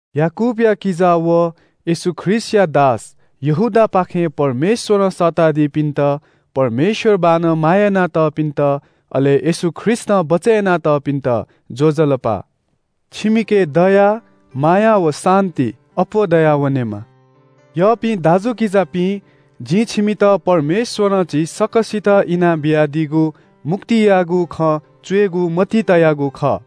याकूबया किजा व येशू ख्रीष्‍टया दास यहूदापाखें परमेश्‍वरं सःतादीपिन्‍त, परमेश्‍वर बाःनं माया यानातःपिन्‍त, अले येशू ख्रीष्‍टं बचय् यानातःपिन्‍त ज्‍वजलपा। छिमिके दया, माया व शान्‍ति अप्‍वः दयावनेमा। यःपिं दाजुकिजापिं, जिं छिमित परमेश्‍वरं झी सकसितं इना बियादीगु मुक्तियागु खँ च्‍वयेगु मतिइ तयागु खः।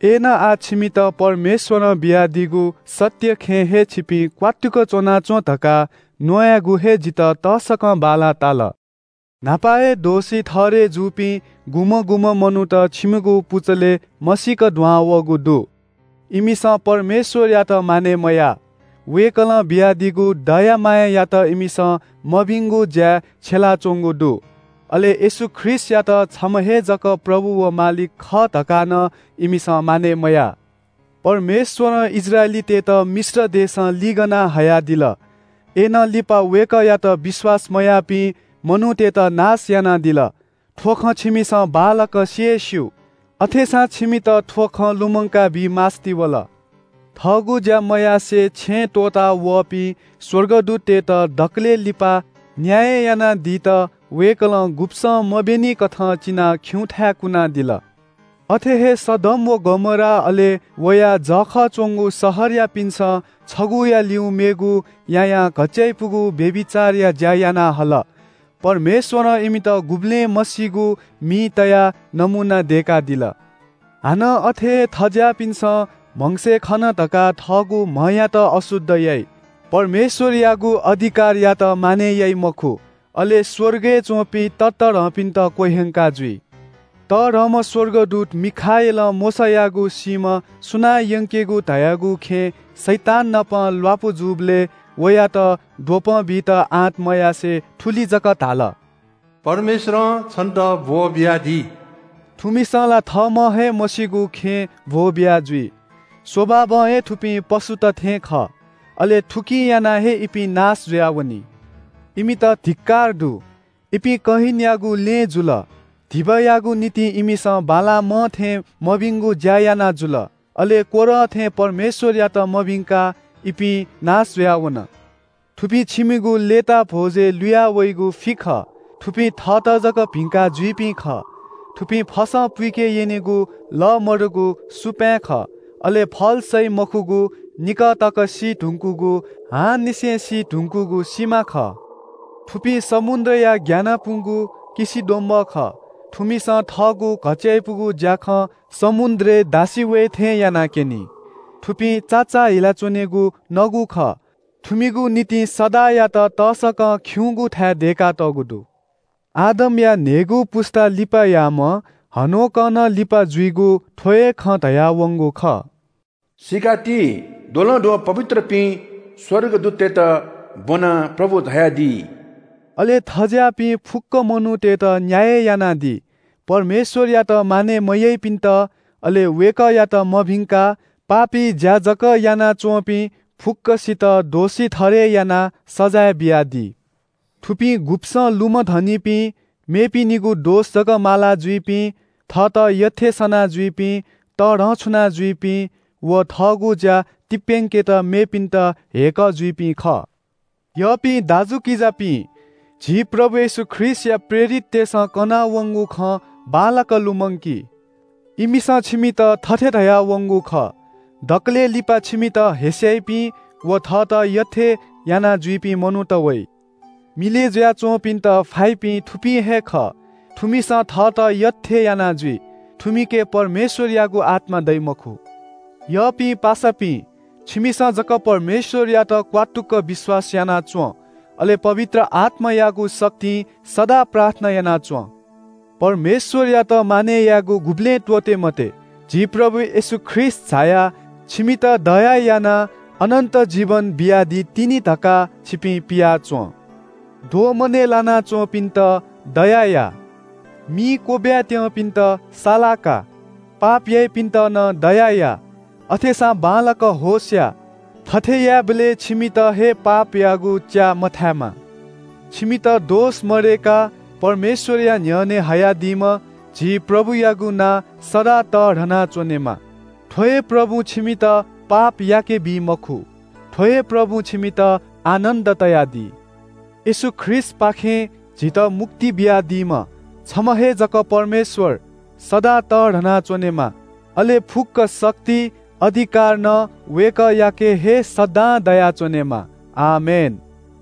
अय्‌नं आः छिमित परमेश्‍वरं बियादीगु सत्‍य खँय् हे छिपिं क्‍वात्तुक च्‍वनाच्‍वँ धकाः न्‍वायेगु हे जितः तसकं बांलाः ताल। न्‍हापा हे दोषी ठहरय् जूपिं गुम्‍हं गुम्‍हं मनूत छिमिगु पुचलय् मसीक दुहां वःगु दु। इमिसं परमेश्‍वरयात मानय् मयाः। वय्‌कलं बियादीगु दया मायायात इमिसं मभिंगु ज्‍याय् छ्यलाच्‍वंगु दु। अले येशू ख्रीष्‍टयात छम्‍ह हे जक प्रभु व मालिक खः धकाः नं इमिसं मानय् मयाः। परमेश्‍वरं इस्राएलीतय्‌त मिश्र देशं लिगना हयादिल। अय्‌नं लिपा वय्‌कःयात विश्‍वास मयाःपिं मनूतय्‌त नाश यानादिल। थ्‍व खँ छिमिसं बांलाक सि हे स्‍यू। अथेसां छिमित थ्‍व खँ लुमंकाबी मास्‍ति वल। थःगु ज्‍या मयासें छेँ त्‍वःतावःपिं स्‍वर्गदूततय्‌त दकलय् लिपा न्‍याय यानादीत वय्‌कलं गुब्‍सं मब्‍यनिकथं चिनाः खिउँथाय् कुनादिल। अथे हे सदोम व गमोरा अले वया जःखः च्‍वंगु शहरयापिन्‍सं छगूया ल्‍यू मेगु यायां घच्‍चाइपुगु व्‍यभिचारया ज्‍या याना हल। परमेश्‍वरं इमित गुबलें मसीगु मिइ तयाः नमूना दय्‌कादिल। हानं अथे हे थज्‍याःपिन्‍सं म्‍हगसय् खन धकाः थःगु म्‍हयात अशुद्ध याइ। परमेश्‍वरयागु अधिकारयात मानय् याइ मखु, अले स्‍वर्गय् च्‍वंपिं ततःधंपिन्‍त क्‍वह्यंकाजुइ। तःधंम्‍ह स्‍वर्गदूत मिखाएलं मोशायागु सीम्‍ह सुनां यंकेगु धयागु खँय् शैताननापं ल्‍वापु जूबलय् वयात द्वपं बीत आँट मयासें थुलि जक धाल – “परमेश्‍वरं छन्‍त ब्‍वःबियादी।” थुमिसं ला थःम्‍हं हे मस्‍यूगु खँय् ब्‍वः बियाजुइ। स्‍वभावं हे थुपिं पशुत थें खः। अले थुकिं यानाः हे इपिं नाश जुयावनी। इमित धिक्‍कार दु। इपिं कयिनयागु लँय् जुल। धिबायागु निंतिं इमिसं बालामं थें मभिंगु ज्‍या याना जुल, अले कोरह थें परमेश्‍वरयात मभिंकाः इपिं नाश जुयाः वन। थुपिं छिमिगु लय्‌ताः भ्‍वजय् लुया वइगु फि खः। थुपिं थःत जक भिंका जुइपिं खः। थुपिं फसं पुइके यनिगु, लः मदुगु सुपाँय् खः। अले फल सइ मखुगु निकः तक सी धुंकूगु, हांनिसें सी धुंकूगु सिमा खः। थुपिं समुद्रया ग्‍यानापुगु किसिद्वम्‍बः खः। थुमिसं थःगु घच्‍चायापुगु ज्‍याखँ समुद्र दासि वये थें यानाक्‍यनी। थुपिं चाचाःहिला च्‍वनीगु नगु खः। थुमिगु निंतिं सदांयात तसकं खिउँगु थाय् दय्‌कातःगु दु। आदमया न्‍हय्‌गू पुस्‍ता लिपायाम्‍ह हनोकं नं लिपा जुइगु थ्‍व हे खँ धयावंगु खः – “सीकाति, द्वलंद्वः पवित्रपिं स्‍वर्गदूततय्‌त ब्‍वनाः प्रभु झायादी।” अले थज्‍याःपिं फुक्‍क मनूतय्‌त न्‍याय यानादी। परमेश्‍वरयात मानय् मयाइपिन्‍त, अले वय्‌कःयात मभिंकाः पापी ज्‍या जक यानाच्‍वंपिं फुक्‍कसितं दोषी ठहरय् यानाः सजाँय बियादी। थुपिं गुब्‍सं लुमधनिपिं, मेपिनिगु दोष जक मालाजुइपिं, थःत यःथें सना जुइपिं, तःधंछुना जुइपिं, व थःगु ज्‍या तिप्‍यंकेत मेपिन्‍त ह्यय्‌कः जुइपिं खः। यःपिं दाजुकिजापिं, झी प्रभु येशू ख्रीष्‍टया प्रेरिततय्‌सं कनावंगु खँ बांलाक लुमंकी। इमिसं छिमित थथे धयावंगु खः – “दकलय् लिपा छिमित हेस्‍याइपिं व थःत यःथें यानाजुइपिं मनूत वइ।” मिलय् जुयाच्‍वंपिन्‍त फाइपिं थुपिं हे खः। थुमिसं थःत यःथें याना जुइ। थुमिके परमेश्‍वरयागु आत्‍मा दइ मखु। यःपिं पासापिं, छिमिसं जक परमेश्‍वरयात क्‍वात्तुक विश्‍वास याना च्‍वँ, अले पवित्र आत्‍मायागु शक्तिं सदां प्रार्थना याना च्‍वँ। परमेश्‍वरयात मानय् यायेगु गुबलें त्‍वःते मते। झी प्रभु येशू ख्रीष्‍ट झायाः छिमित दया यानाः अनन्‍त जीवन बियादीतिनि धकाः छिपिं पियाच्‍वँ। दोमनय् लानाच्‍वंपिन्‍त दया या। मिइ क्‍वब्‍वाय् त्‍यंपिन्‍त साला का। पाप याइपिन्‍त नं दया या। अथेसां बांलाक होश या, थथे यायेबलय् छिमित हे पापयागु च्‍याः मथायेमा। छिमित दोष मदय्‌काः परमेश्‍वरया न्‍ह्यःने हयादीम्‍ह झी प्रभुयागु नां सदां तःधना च्‍वनेमा। थ्‍व हे प्रभुं छिमित पाप याकेबी मखु। थ्‍व हे प्रभुं छिमित आनन्‍दं तयादी। येशू ख्रीष्‍टपाखें झीत मुक्ति बियादीम्‍ह, छम्‍ह हे जक परमेश्‍वर सदां तःधना च्‍वनेमा। अले फुक्‍क शक्ति, अधिकार नं वय्‌कःयाके हे सदां दयाच्‍वनेमा। आमेन।